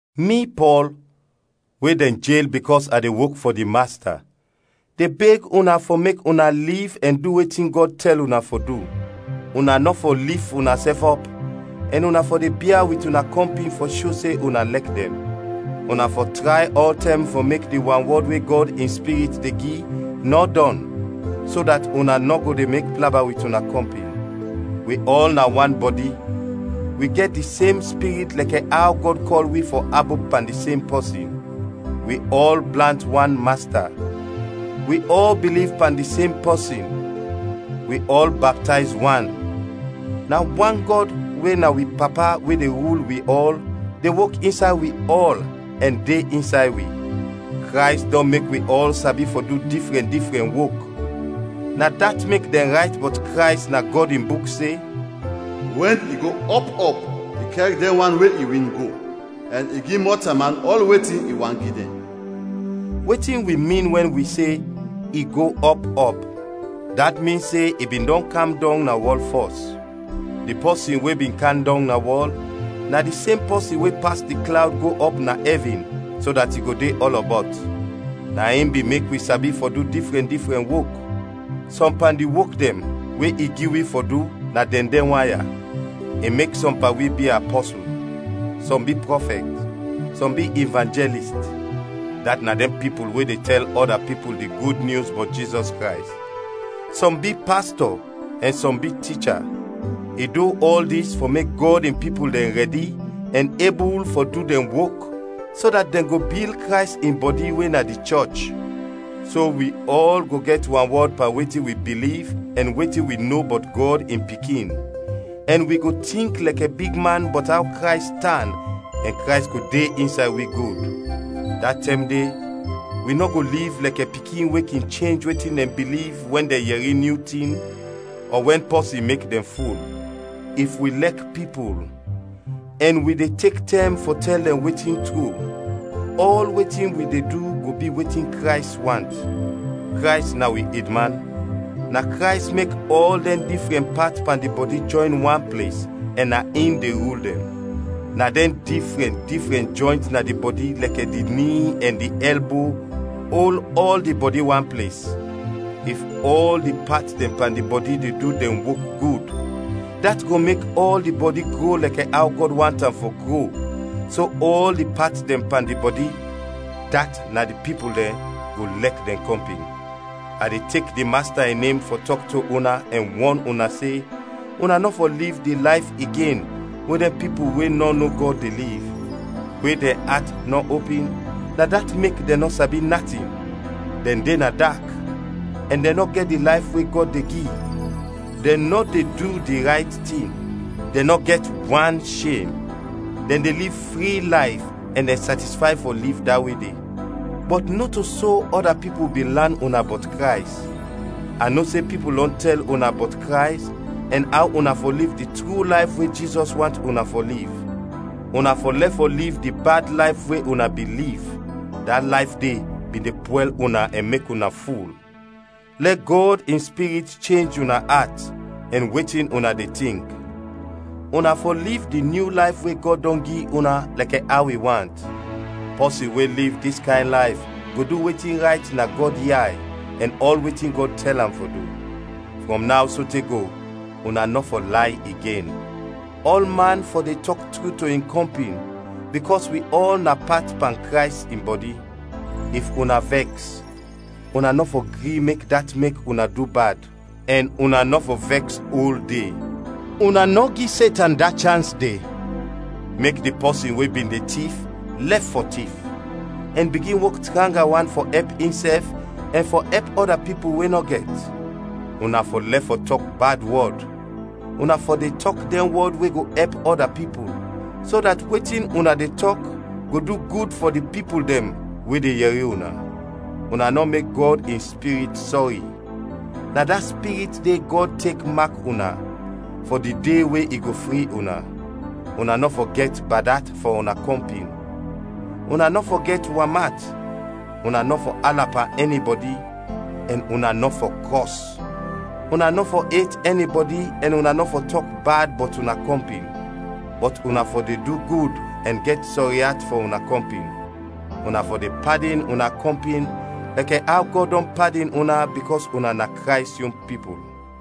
Mi, Pɔl, we dɛn jel bikɔs a de wok fɔ di Masta, de beg una fɔ mek una liv ɛn du wetin Gɔd tɛl una fɔ du. Una nɔ fɔ lif unasɛf ɔp ɛn una fɔ de bia wit una kɔmpin fɔ sho se una lɛk dɛn. Una fɔ tray ɔltɛm fɔ mek di wanwɔd we Gɔd in Spirit de gi, nɔ dɔn, so dat una nɔ go de mek plaba wit una kɔmpin. Wi ɔl na wan bɔdi, wi gɛt di sem Spirit lɛkɛ aw Gɔd kɔl wi fɔ abop pan di sem pɔsin. Wi ɔl blant wan Masta, wi ɔl biliv pan di sem pɔsin, wi ɔl baptayz wan, na wan Gɔd we na wi Papa we de rul wi ɔl, de wok insay wi ɔl ɛn de insay wi. Krays dɔn mek wi ɔl sabi fɔ du difrɛn, difrɛn wok. Na dat mek dɛn rayt bɔt Krays na Gɔd in Buk se, “Wɛn i go ɔp ɔp, i kɛr dɛn wan we i win, go; ɛn i gi mɔtalman ɔl wetin i want gi dɛn.” Wetin wi min wɛn wi se “I go ɔp ɔp?” Dat min se i bin dɔn kam dɔng na wɔl fɔs. Di pɔsin we bin kam dɔng na wɔl, na di sem pɔsin we pas di klawd go ɔp na ɛvin, so dat i go de ɔlɔbɔt. Na in bin mek wi sabi fɔ du difrɛn difrɛn wok. Sɔm pan di wok dɛn we i gi wi fɔ du na dɛn dɛn wan ya: I mek sɔm pan wi bi apɔsul; sɔm bi prɔfɛt; sɔm bi ivanjɛlist, dat na dɛn pipul we de tɛl ɔda pipul di Gud Nyus bɔt Jizɔs Krays; sɔm bi pastɔ; ɛn sɔm bi ticha. I du ɔl dis fɔ mek Gɔd in pipul dɛn rɛdi ɛn ebul fɔ du dɛn wok, so dat dɛn go bil Krays in bɔdi we na di chɔch. So wi ɔl go gɛt wanwɔd pan wetin wi biliv ɛn wetin wi no bɔt Gɔd in Pikin, ɛn wi go tink lɛkɛ bigman bɔt aw Krays tan ɛn Krays go de insay wi gud. Da tɛm de wi nɔ go liv lɛkɛ pikin we kin chenj wetin dɛn biliv wɛn dɛn yɛri nyu tin, ɔ wɛn pɔsin mek dɛn ful. If wi lɛk pipul ɛn wi de tek tɛm fɔ tɛl dɛn wetin tru, ɔl wetin wi de du go bi wetin Krays want. Krays na wi edman. Na Krays mek ɔl dɛn difrɛn pat pan di bɔdi jɔyn wan ples ɛn na in de rul dɛn. Na dɛn difrɛn, difrɛn jɔynt na di bɔdi lɛkɛ di ni ɛn di ɛlbo ol ɔl di bɔdi wan ples. If ɔl di pat dɛn pan di bɔdi de du dɛn wok gud, dat go mek ɔl di bɔdi gro lɛkɛ aw Gɔd want am fɔ gro, so ɔl di pat dɛn pan di bɔdi, dat na di pipul dɛn, go lɛk dɛn kɔmpin. A de tek di Masta in nem fɔ tɔk to una ɛn wɔn una se, una nɔ fɔ liv di layf igen we dɛn pipul we nɔ no Gɔd de liv. We dɛn at nɔ opin, na dat mek dɛn nɔ sabi natin; dɛn de na dak ɛn dɛn nɔ gɛt di layf we Gɔd de gi. Dɛn nɔ de du di rayt tin, dɛn nɔ gɛt wan shem. Dɛn de liv fri layf ɛn dɛn satisfay fɔ liv da we de. Bɔt nɔto so ɔda pipul bin lan una bɔt Krays. A no se pipul dɔn tɛl una bɔt Krays ɛn aw una fɔ liv di tru layf we Jizɔs want una fɔ liv. Una fɔ lɛf fɔ liv di bad layf we una bin liv, da layf de bin de pwɛl una ɛn mek una ful. Lɛ Gɔd in Spirit chenj una at ɛn wetin una de tink. Una fɔ liv di nyu layf we Gɔd dɔn gi una lɛkɛ aw i want. Pɔsin we liv dis kayn layf go du wetin rayt na Gɔd yay ɛn ɔl wetin Gɔd tɛl am fɔ du. Frɔm naw sote go, una nɔ fɔ lay igen. Ɔlman fɔ de tɔk tru to in kɔmpin, bikɔs wi ɔl na pat pan Krays in bɔdi. If una vɛks, una nɔ fɔ gri mek dat mek una du bad, ɛn una nɔ fɔ vɛks ol de. Una nɔ gi Setan da chans de. Mek di pɔsin we bin de tif lɛf fɔ tif, ɛn bigin wok tranga wan fɔ ɛp insɛf ɛn fɔ ɛp ɔda pipul we nɔ gɛt. Una fɔ lɛf fɔ tɔk bad wɔd, una fɔ de tɔk dɛn wɔd we go ɛp ɔda pipul, so dat wetin una de tɔk go du gud fɔ di pipul dɛn we de yɛri una. Una nɔ mek Gɔd in Spirit sɔri, na da Spirit de Gɔd tek mak una, fɔ di de we i go fri una. Una nɔ fɔ gɛt bad at fɔ una kɔmpin, una nɔ fɔ gɛt wam at, una nɔ fɔ ala pan ɛnibɔdi, ɛn una nɔ fɔ kɔs. Una nɔ fɔ et ɛnibɔdi ɛn una nɔ fɔ tɔk bad bɔt una kɔmpin. Bɔt una fɔ de du gud ɛn gɛt sɔri at fɔ una kɔmpin. Una fɔ de padin una kɔmpin lɛkɛ aw Gɔd dɔn padin una bikɔs una na Krays yon pipul.